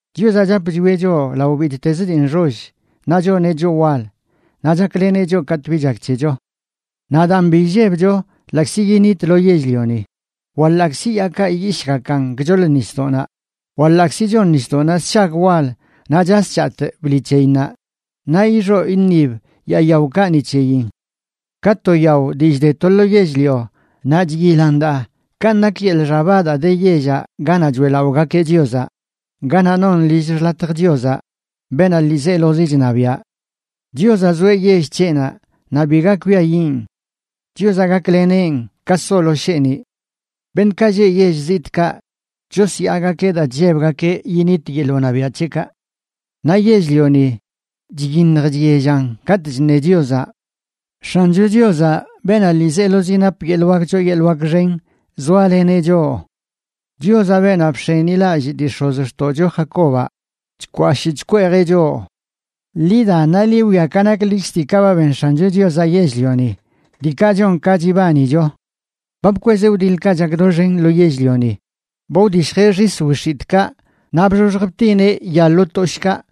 Chiozaꞌ chap chwieꞌ choꞌ lao bittezə dii nxoll, naꞌ choneꞌ choꞌ wal; naꞌ chakleneꞌ choꞌ katꞌ bi chak c̱hecho. Naꞌ daan bi illebcho ḻaꞌkzi yinitlo yell-lioni, wa ḻaꞌkzi yaakaꞌ iyishꞌgakan gchoḻ nisdoꞌnaꞌ, wa ḻaꞌkzi chon nisdoꞌnaꞌ sshag wal naꞌ chas chatꞌ bḻi c̱heyinnaꞌ, naꞌ ixoꞌ iṉib yaa yaokaꞌ ni c̱heyin. Ka to yao dii chde to lo yell-lio naꞌ chyilan daa, kanꞌ nak yeḻꞌ xaba daa de yellaꞌ ganaꞌ choeꞌlaꞌogakeꞌ Chiozaꞌ, ganaꞌ non lill xḻatjə Chiozaꞌ, beenaꞌ ḻiizelozi chṉabiaꞌ. Chiozaꞌ zoeꞌ yell c̱heꞌnaꞌ, naꞌ biga kwiayiꞌn. Chiozaꞌ gakleneꞌn ka solo sheeniꞌ. Beṉꞌkaꞌ lleꞌ yell zitꞌkaꞌ chosyaagakeꞌ daa chllebgakeꞌ yinit yeḻꞌ wṉabiaꞌ c̱heꞌkaꞌ. Naꞌ yell-lioni chyiṉj chyellan katꞌ chṉe Chiozaꞌ. ¡X̱ancho Chiozaꞌ, beenaꞌ ḻiizelozi nap yeḻꞌ wak choo yeḻꞌ wak xen, zoaleneꞌ choꞌ! ¡Chiozaꞌ, beenaꞌ bx̱enilallꞌ dii x̱ozxtoꞌcho Jacobaꞌ, chkwashꞌ chkweejeꞌ choꞌ! Ḻi da, naꞌ ḻi wwia ka naklikz diikaꞌ ba ben X̱ancho Chiozaꞌ yell-lioni, diikaꞌ chon ka chibanicho. Ba bkwezeꞌ wdiḻkaꞌ chak doxen lo yell-lioni; ba wdishjeꞌ xis wix̱itꞌkaꞌ, naꞌ bxoxj btineꞌ ya lo toshꞌkaꞌ,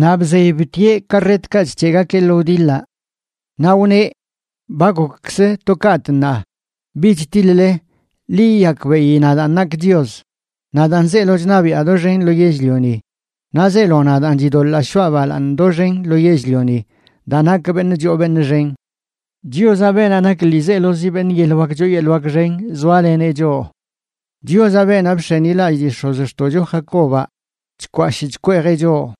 naꞌ bzey btieꞌ karretkaꞌ chc̱heꞌgakeꞌ lo wdiḻaꞌ. Naꞌ wneꞌ: “Ba gokkzə to kaꞌtꞌ ṉaa; bich tiḻ-le. Ḻi yiyakbeꞌi nadaan nakꞌ Chios. Nadaan zeelo chṉabiaꞌ doxen lo yell-lioni, naꞌ zeelo nadaan chidoḻaa shoꞌa balaaṉ doxen lo yell-lioni daa nakꞌ beṉꞌ choo beṉꞌ xen.” Chiozaꞌ, beenaꞌ nak ḻiizelozi beṉꞌ yeḻꞌ wak choo yeḻꞌ xen, zoaleneꞌ choꞌ. ¡Chiozaꞌ, beenaꞌ bx̱enilallꞌ dii x̱ozxtoꞌcho Jacobaꞌ, chkwashꞌ chkweejeꞌ choꞌ!